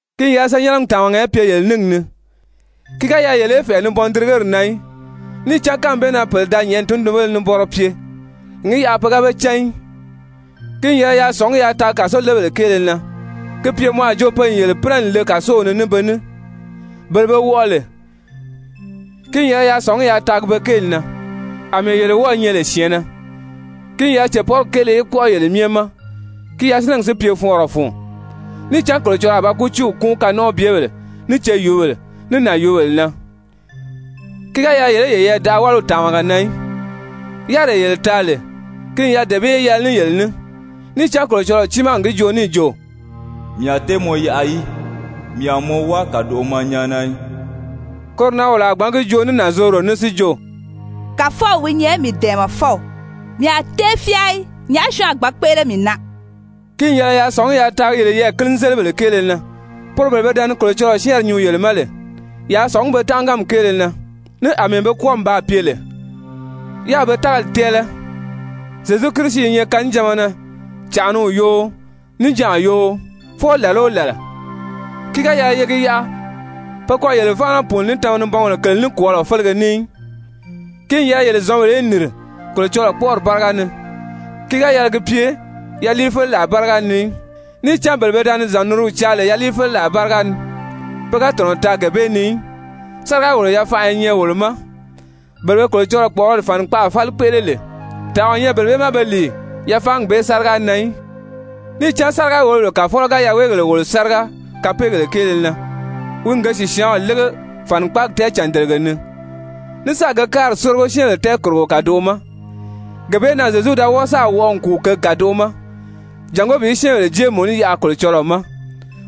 Ki n yɛlɛ senyɛnnɛgi tàmaga í pye yele níngi ni. Ki ga yɛlɛ yele í fɛ̀ʔɛ nibɔndirigeri na í, níì cán kánmi bee na pèle da nyɛ̀ʔɛni tundunbéle nibɔnrɔ pye, n gi yaʔa pe ga be cán í. Ki n yɛlɛ yaa sɔ̀ngí yaa taagi kàsolebèle kéele na, gi pye mɔ a jo pe n yele pínɛ n le kàsow ni ní be ní, bele be wɔʔɔ lè, ki n yɛlɛ yaa sɔ̀ngí yaa taagi be kéeli na, àmɛɛ yele wɔ́ɔ̄ nyɛ lè syɛ̀ɛnnɛ. Ki n yɛlɛ cèpɔrigi kéele í kpɔ́ʔɔ yele myɛ ma, ki yasinɛgi si pye fɔɔnrɔ fun. Níì cán Kolocɔlɔɔ a ba kútiiw kúun kanɔnʔɔbyebèle, ní ceyuubèle, ní nànyuubèle na. Ki ga yɛlɛ yele í yeyɛɛ daʔa wáliw tàmaga na í. Yáriree yele taa lè, ki n yɛlɛ dee bee í yɛlɛ ní yele ní, níì cán Kolocɔlɔɔ tiimaa n gi joo níì jo: «Mii a tée mɔ yaʔa í, mii a mɔ wáa kàdoʔo ma nyáana í.» Koro na wolo a gbǎn gi joo ní nànzorodo ní si jo: «Kàfɔw wi nyɛ mii dɛ̀ɛmɛfɔw, mii a tée fyáa í. Nyàʔá syɔɔn a gbǎn kpéʔele mii na?» Ki n yɛlɛ yaa sɔ̀ngí yaa taagi yele yɛɛ̀kini-zélibèle kéele na, poro bele pe da ni Kolocɔlɔɔ syɛ́ɛnri nyuu yele ma lè. Yaa sɔ̀ngí be tánʔaganmi kéele na, ní àmɛɛ be kwɔ́ɔmi baa pye lè, yáā be tágali tɛ́ɛlɛ. Zyezu Kirisi i nyɛ kanijanma na cànʔaniw yoo, níjanʔa yoo, fwɔɔ làla o làla. Ki ga yɛlɛ ye gi yaʔa pe kɔ yele fáana pùuni ní tama-nibɔngèle kèle nikwɔɔlɔ félege ní í, ki n yɛlɛ yele zɔ̌nbèle í nìri Kolocɔlɔɔ kpɔ́ʔɔri báriga ni, ki ga yɛlɛ gi pye yaliifeleraa báriga ni í. Níì cán bele pe da ni zɔ̀nniriw caa lè yaliifeleraa báriga ni, pe ga tɔ̀nɔ taa gee bee ni í. Sáriga-wòlo-yafanʔa i nyɛ wolo ma, bele be Kolocɔlɔɔ kpɔ̀ʔɔrɔli fànikpaʔa fáli kpéʔele lè, tànʔa o nyɛ bele bee ma be lìi yafaangi bee sáriga na í. Níì cán sáriga-wòlobèle kàfɔlɔ ga yaweegèle wòlo sáriga kapeegèle kéele na, wi n ge sìsyaanw lége fànikpaagi tɛɛcàndelege ni, ní sáà ge káari sórigo syɛ́ɛnbèle tɛɛkòrogo kàdoʔo ma. Gee bee na Zyezu da wɔ́ɔ sáà wɔʔɔ n kùu kěgi kàdoʔo ma, jàngó bi syɛ́ɛnbèle jée mùnú yaʔa Kolocɔlɔɔ ma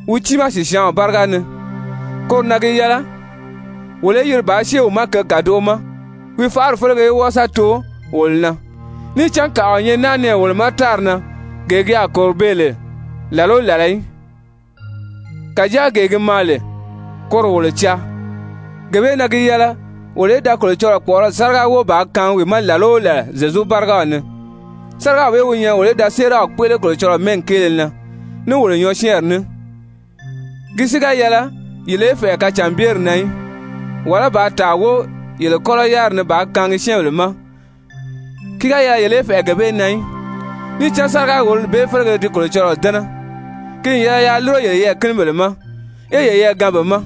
wi tiimaa sìsyaanw báriga ni. Koro na gi yɛlɛ wolo í yiri bàā syée wi ma kěgi kàdoʔo ma, wi faʔari félege í wɔ́ɔ sa too wolo na. Níì cán kàʔa o nyɛ naa nɛɛ wolo ma tári na gee ki a kòro beè lè làla o làla í, kàjáa gee gi maa lè, koro wolo caa. Gee bee na gi yɛlɛ wolo í da Kolocɔlɔɔ kpɔ̀ʔɔrɔli sáriga wóo bàā kaangi wi ma làla o làla Zyezu bárigaw ni, sárigaw bee wi nyɛ wolo í da séeraw kpéʔele Kolocɔlɔɔ mɛ́ɛgi kéele na ní wolo nyɔɔsyɛɛnri ní. Ki si ga yɛlɛ yele í fɛ̀ʔɛ kacànbyeri na í, wàlá bàā tàa wóo yele kɔ́lɔ yáriri ni bàā kaangi syɛ́ɛnbèle ma, ki ga yɛlɛ yele í fɛ̀ʔɛ gee bee na í, níì cán sáriga-wòlori bee félege di Kolocɔlɔɔ dɛ́nɛ. Ki n yɛlɛ yaa lúro yele yɛɛ̀kinibèle ma, yé yeyɛɛ gaan be ma.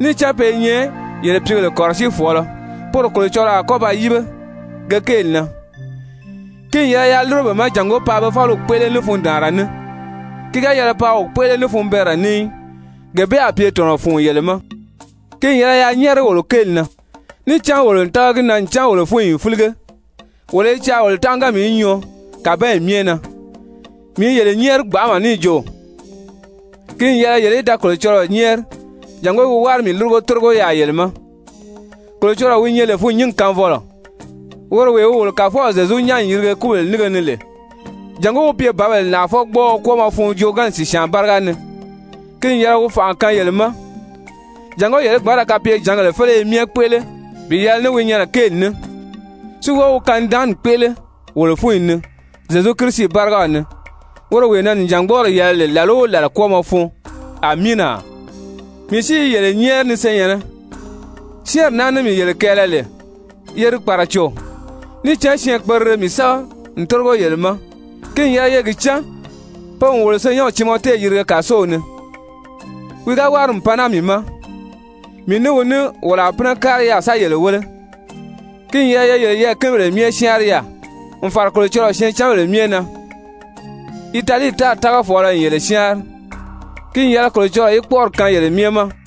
Níì cán pe i nyɛ yele pìígèle kɔ̀rɔsiifɔɔlɔ, poro Kolocɔlɔɔ a kɔ́ ba yíbe ge kéeli na. Ki n yɛlɛ yaa lúro be ma jàngó paa be fáliw kpéʔele ní fundaanra ní, ki ga yɛlɛ paa wi kpéʔele ní funbɛɛnrɛ ní í, gee bee a pye tɔ̀nɔ fun yele ma. Ki n yɛlɛ yaa nyɛ́ɛri wolo kéeli na, níì cán wolo n tága gi na ncan wolo fúnyi n fílige, wolo i caa wolo tánʔaganmi í nyɔɔ kàbanyi myɛ na. Mii i yele nyɛ́ɛri gbanʔama, níì jo ki n yɛlɛ yele í da Kolocɔlɔɔ nyɛ́ɛri jàngó wi wári mii lúrugo tórigo yaà yele ma. Kolocɔlɔɔ wi nyɛ lè fûnnyingi kaanfɔlɔ, woro wee wi wolo Kàfɔw Zyezu nyán n yirige kúbèle nínge ni lè, jàngó wi pye bǎbèle nàʔafɔgbɔɔɔ kwɔ́ɔmɔ fun joogaanni sìsyaan báriga ni, ki n yɛlɛ wi fànʔa kaan yele ma jàngó yele í gbǎn ra kapyejǎngèle féleye myɛ kpéʔele bi yɛlɛ ní wi nyɛnɛ kéeli ní, si wɔ́ɔ wi kanidaanni kpéʔele wolo fúnyi ni Zyezu Kirisi bárigaw ni, woro wee na nìjangbɔɔri yɛlɛ lè làla o làla kwɔ́ɔmɔ fun! Amiina! Mii si i yele nyɛ́ɛri ni senyɛ̀nnɛ, syɛ́ɛnri naa ní mii yele kɛɛlɛ lè, ye di kpàraco. Níì cán syɛɛnkperire mii sɛ́bɛ n tórigo yele ma. Ki n yɛlɛ ye gi cán pe n wolo senyɛnw Timɔte yirige kàsow ni. Wi ga wári n pan naa mii ma, mii ní wi ní wolo a pínɛ kári yaà sa yele wéle. Ki n yɛlɛ ye yele yɛɛ̀kinibèle myɛ syáanri yaà, n fàra Kolocɔlɔɔ syɛɛncanbèle myɛ na. Italii tári tágafɔɔlɔ n yele syáanri. Ki n yɛlɛ Kolocɔlɔɔ í kpɔ́ʔɔri kaan yele myɛ ma!